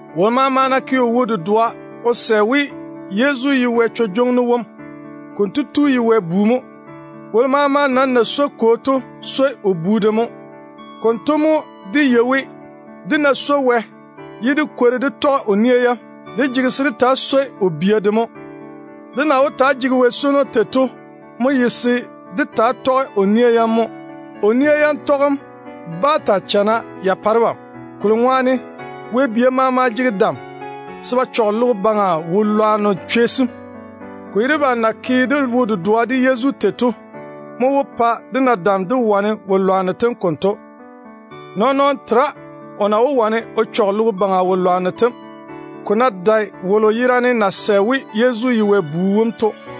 Wolo maama ná ke o wo-dedoa o sɛ we Yezu ye Wɛ Dam Tu wom, konto tu ye Wɛ bu mo. Wolo maama nam na swoi kwo to swoi kwo wom na loge bu wolo to de mo. Konto mo dé yei we, dé ná swoi Wɛ ye dé kwori dé tɔge o nia yam, dé jege se dé taa swoi o bia de mo. Dé na wó taa jege Wɛ swono tei to mo ye se dé taa tɔge o nia yam. O nia yam tɔgem bá taa chana ya pae debam, kolo ŋwaane Wɛ bia maama jege dam se ba chɔge logo baŋa wo-lwanno chwei sem. Ko ye debam na ke dé wo-dedoa de Yezu tei to mo wó pa dé na dam dé wane wo-lwanno tem konto. Nɔɔn-nɔɔno tera o na wó wane o chɔge logo baŋa wo-lwanno tem, ko ná dae wolo yerane na sɛ we Yezu ye Wɛ Bu wom to.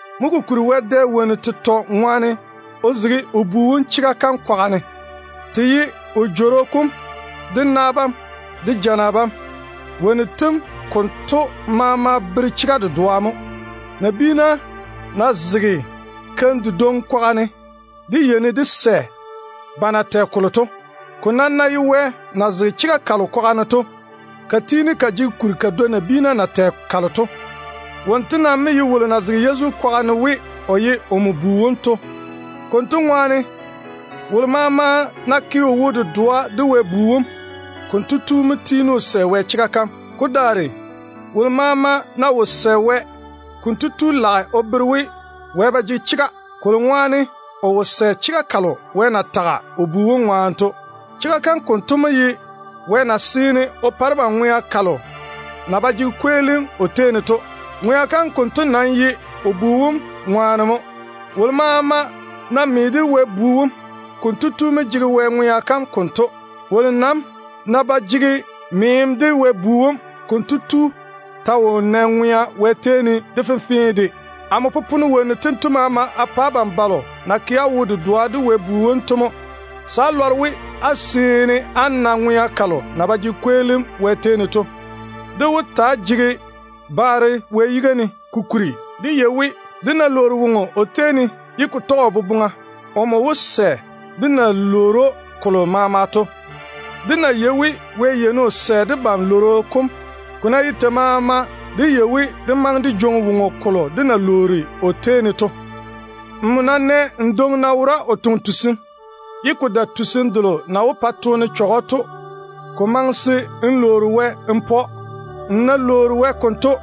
Mo kokuri Wɛ dɛ wonnu tetɔ ŋwaane o zege o Bu wom chega kam kwaga ne. Te ye Wɛ Jworo kom, de na bam, de jana bam, ye te maama jege ni dedwe. Nabiina ná zege keim dedwoŋi kwaga ne, dé yeini dé sɛ ba na tɛ kolo to. Ko nam ná ye Wɛ na zege chega kalo kwaga ne to, ka tiini ka jege kuri ka dwoi nabiina na tɛ kalo to. Wonto nam mo ye wolo na zege Yezu kwaga ne o bere we, o ye omo Bu to. Konto ŋwaane, wolo maama ná ke o wo-dedoa de Wɛ Bu wom, konto tu jege Wɛ chega kam o bochare ne. Ko daare wolo maama ná wo sɛ Wɛ, konto tu lage o bere we Wɛ ye vwa-nyem mo, kolo ŋwaane o wo sɛ chega kalo Wɛ na tage o Bu wom ŋwaane to. Chega kam konto mo ye Wɛ na seene o pa debam ŋwea kalo na ba jege kweelim o tei ne to. Ŋwea kam konto nam ye o Bu wom ŋwaane mo. Wolo maama ná me de Wɛ Bu wom, konto tu mo jege Wɛ ŋwea kam konto. Wolo nam ná ba jege meem de Wɛ Bu wom, konto tu ta wo nɛ ŋwea Wɛ tei ne. Amo popone wonnu tento maama a pa abam balo na ke á wo-dedoa de Wɛ Bu wom to, se á lɔre we á seene á na ŋwea kalo na ba jege kweelim Wɛ tei ne to. Dé wó taa jege baare Wɛ yiga ne, kokuri dé yei we, dé ná lwoori woŋo o tei ne ye ko tɔge o boboŋa, o wó cheigi dé wɛ-lworo kom. Dé yei we Wɛ yeini o sɛ debam wɛ-lworo kom, ne ko ná ye tei maama. Konto ŋwaane dé yei we dé wó jwoŋi woŋo kolo dé na lwoori o tei ne to. Nmo ná nɛ n dwoŋi na wora o toŋe tusim, ye ko dae tusim delo na wó pa toone chɔge‑o to, ko maŋe se n lwoori Wɛ mo n pa‑o. N ná lwoori Wɛ konto,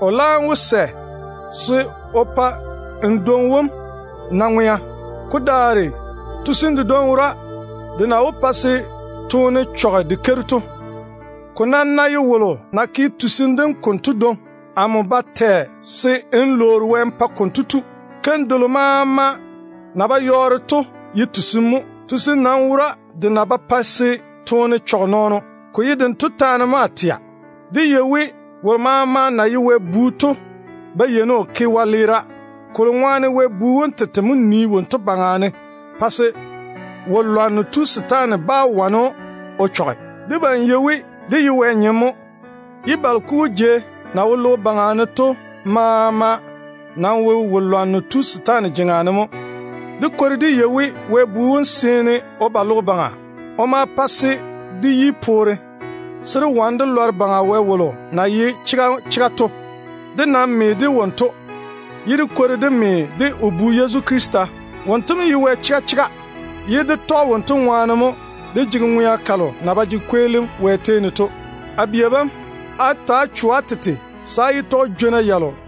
o laam wó sɛ se o pa n dwoŋi wom na ŋwea. Ko daare, tusim dedwoŋi wora de na wó pa se toone chɔge de keiru to. Ko nam ná ye wolo na ke tusim dem konto dwoŋi, amo ba tɛ se n lwoori Wɛ n pa konto tu. Keim delo maama na ba tɔge chega to ye tusim mo. Tusim nam wora de na ba pae se toone chɔge nɔɔno. Ko ye dento taane mo a tɛa. Dé yei we wolo maama na ye Wɛ bu to ba yeini o ke wɛleera, kolo ŋwaane Wɛ Bu wom tete mo nii wonto baŋa ne pa se wo-lwanno tu setaane bá wane‑o o chɔge. Debam yei we de ye Wɛ nyem mo, ye balo kugu jei na wo logo baŋa ne to maama nam wo wo-lwanno tu setaane jeŋa ne mo. Dé kwori dé yei we, Wɛ Bu wom mo tu logo baŋa. O ma pa se dé yi poore, se dé wane dé lɔre Baŋa Wɛ wom na ye chega chega to. Dé nam me de wonto, ye dé kwori dé me de o Bu Yezu Krista. Wonto mo ye Wɛ chega chega, ye dé tɔge wonto ŋwaane mo dé jege ŋwea kalo na ba jege kweelim Wɛ tei ne to. A bia bam, ta‑á cho-na á tete se á yé tɔge jwona.